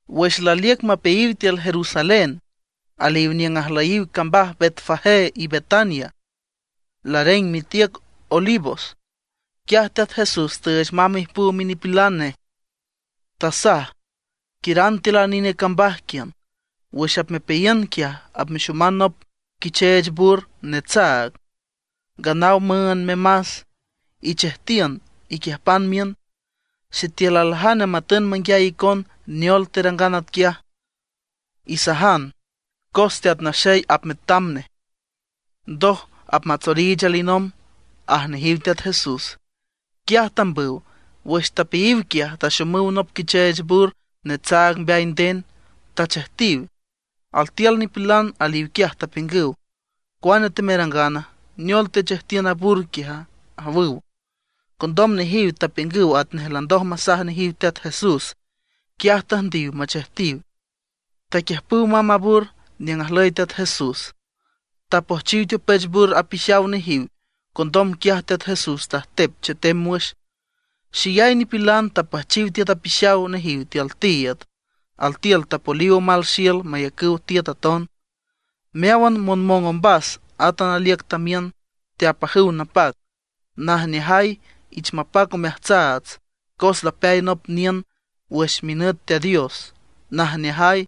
Wüx laliüc mapeayiw tiül Jerusalén, aliw niüng ajlüyiw cambaj Betfagé y Betania, lareng mitiüc Olivos, quiaj Teat Jesús tüüch mamb ijpüw minipilan nej, tasaj: ―Quiüran tiül a nine cambaj quiün. Wüx apmepeayiün quiaj, apmexoman nop quicheech bur netsaag, nganaw müünd memas. Ichejtiün, iquiüjpan miün. Sitiül aljane matün manguiay icon neol terangan atquiaj, isajan cos Teat Naxey apmetam nej, ndoj apmatsoriich alinomb ―aj nejiw Teat Jesús. Quiaj tambüw. Wüx tapeayiw quiaj, taxomüw nop quicheech bur netsaag mbeay nden, tachejtiw. Altiül nipilan aliw quiaj tapiüngüw: ―¿Cua temerangana? ¿Neol techejtiün a bur quiaja? ―awüw. Condom nejiw tapiüngüw atnej landoj masaj nejiw Teat Jesús. Quiaj tüjndiw machejtiw. Taquiüjpüw mamb a bur niüng ajlüy Teat Jesús. Tapojchiw teopech bur apixaw nejiw. Condom quiaj Teat Jesús tajtep chetem wüx. Xeyay nipilan tapüjchiw tiüt apixaw nejiw tiül tiiüd, altiül tapoliw omal xiül mayacüw tiüt aton. Meáwan monmong ombas átan aliüc tamiün teapajüw napac: ―¡Najneajay! ¡Ich mapac omeajtsaats, cos lapeay nop niün wüx minüt Teat Dios! ¡Najneajay!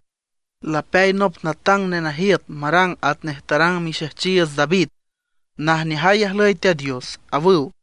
¡Lapeay nop natang nenajiüt marang atnej tarang mixejchiiüts David! ¡Najneajay ajlüy Teat Dios! ―awüw.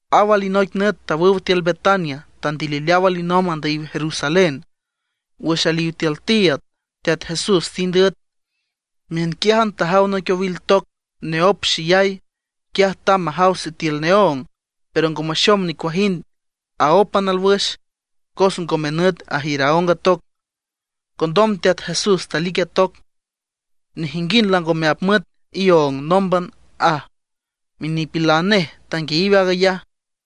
Aw alinoic nüt tawüw tiül Betania, tandilileaw alinomb andüyiw Jerusalén. Wüx aliw tiül tiiüd, Teat Jesús tind üet. Miünquiájan tajaw noic owil toc neóp xeyay. Quiaj tamb majaw sitiül neóng, pero ngo maxom nicuajind, aópan alwüx, cos ngome nüt ajiür aóng toc. Condom Teat Jesús talic a toc: ―Nejinguind langome apmüet ióng nómban ―aj. Minipilan nej tanguiayiw aag ayaj.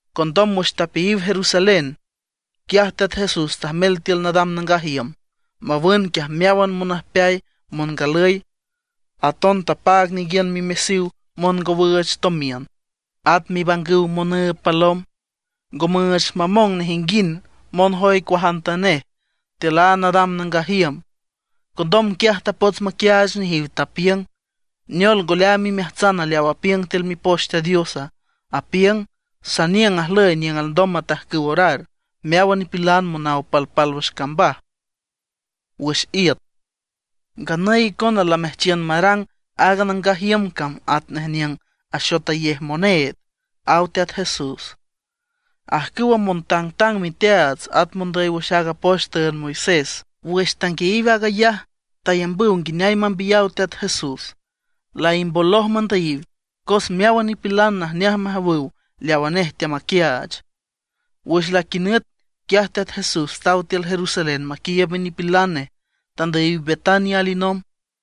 Condom wüx tapeayiw Jerusalén, quiaj Teat Jesús tajmel tiül nadam nangaj iüm mawün quiaj meáwan monüjpeay, mongalüy. Aton tapaag ninguiün mimesiw mongowüüch tomiün, at mibangüw monüüb palom. Ngo müüch mamong nejinguind monjoy cuajantanej tiül a nadam nangaj iüm. Condom quiaj tapots maquiaach nejiw, tapiüng: ―¿Neol ngo leaam imeajtsan leaw apiüng tiül Mipoch Teat Dios? Apiüng: “Saniüng ajlüy niüng alndom matajcüw orar meáwan nipilan monaw palpálwüx cambaj wüx iüt”. Nganüy icona lameajchiün marang aaga nangaj iüm cam atnej niüng axotayej moneed ―aw Teat Jesús. Ajcüwa montangtang miteaats, at mondüy wüx aaga poch tüünd Moisés, wüx tanguiayiw aag ayaj tayambüw nguineay mambiyaw Teat Jesús. Laimboloj mandüyiw, cos meáwan nipilan najneaj majawüw leawa nej teamaquiaach. Wüx laquinüt, quiaj Teat Jesús taw tiül Jerusalén maquiiüb minipilan nej, tandüyiw Betania alinomb.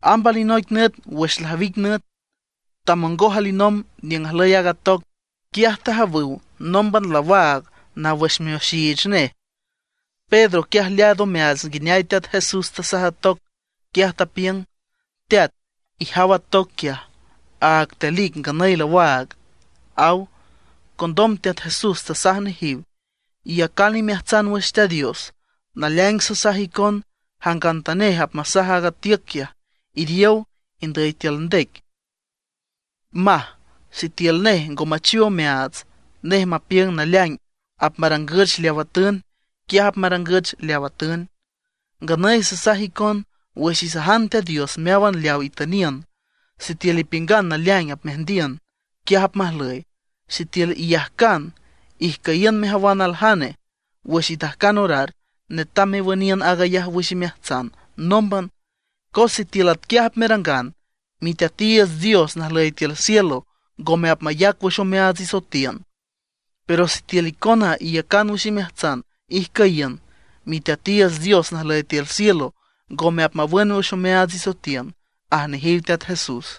Amb alinoic nüt wüx lajwic nüt, tamongoj alinomb niüng ajlüy aaga toc. Quiaj tajawüw nómban lawaag naw wüx mioxiich nej. Pedro quiaj leaad omeaats nguineay Teat Jesús tasaj a toc. Quiaj tapiüng: ―Teat, ijaw a toc quiaj, áag telic, nganüy lawaag ―aw. Condom Teat Jesús tasaj nejiw: ―Iyacan imeajtsan wüx Teat Dios. Naleaing sasaj icon, jangantanej apmasaj aaga tiüc quiaj: “Iriow, indüy tiül ndec”, maj, sitiül nej ngo machiw omeaats, nej mapiüng naleaing apmarangüch leawa atün, quiaj apmarangüch leaw atün. Nganüy sasaj icon, wüx isajan Teat Dios meáwan leaw itüniün, sitiül ipiüngan naleaing apmeajndiün, atquiaj apmajlüy. Sitiül iyajcan ijcüyiün mejawan aljane, wüx itajcan orar netam mewüniün aag ayaj wüx imeajtsan nómban. Cos sitiül atquiaj apmerangan, Miteatiiüts Dios najlüy tiül cielo ngome apmayac wüx omeaats isoetiün. Pero sitiül icona iyacan wüx imeajtsan ijcüyiün, Miteatiiüts Dios najlüy tiül cielo, ngome apmawün wüx omeaats isoetiün ―aj nejiw Teat Jesús.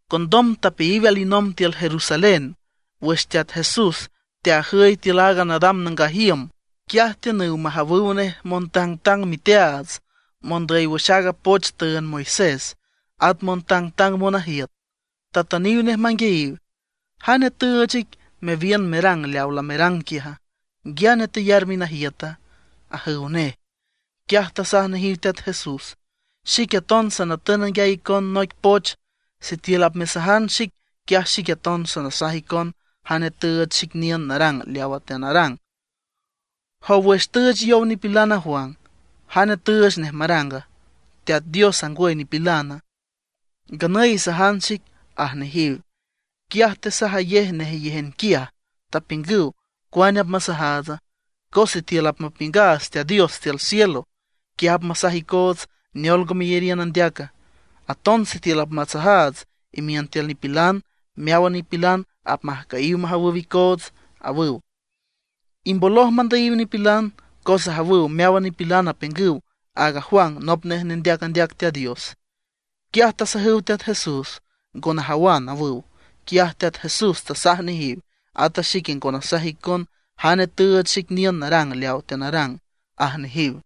Condom tapeayiw alinomb tiül Jerusalén. Wüx Teat Jesús teajüy tiül aaga nadam nangaj iüm, quiaj tiünüw majawüw nej montang miteaats, mondüy wüx aaga poch tüünd Moisés, at montangtang monajiüt. Tatüniw nej manguiayiw: ―¿Jane tüüch ic mewiün merang leawa lamerang quiaja, nguiane teyar minajiüta? ―ajüw nej. Quiaj tasaj nejiw Teat Jesús: ―Xique aton sanatün nanguiay icon noic poch, sitiül apmesajan xic, quiaj xique aton sanasaj icon jane tüüch xic niün narang leawa teanarang. Jow, wüx tüüch yow nipilan aaga Juan, ¿jane tüüch nej maranga? ¿Teat Diosa, ngwüy nipilana? Nganüy isajan xic ―aj nejiw. Quiaj tesajsajayej nejeyéjan quiaj, tapiüngüw: ―¿Cuane apmasajaatsa? Cos sitiül apmapiüngaats Teat Dios tiül cielo, quiaj apmasaj icoots: “¿Neol ngo meyariün andeaca?” Aton sitiül apmasajaats imiün tiül nipilan, meáwan nipilan apmajcüyiw majawüw icoots ―awüw. Imboloj mandüyiw nipilan, cos ajawüw meáwan nipilan apiüngüw aaga Juan nop nej nendeac andeac Teat Dios. Quiaj tasajüw Teat Jesús: ―Ngo najawan ―awüw. Quiaj Teat Jesús tasaj nejiw: ―Ata xique ngo nasaj icon jane tüüch xic niün narang leaw teanarang ―aj nejiw.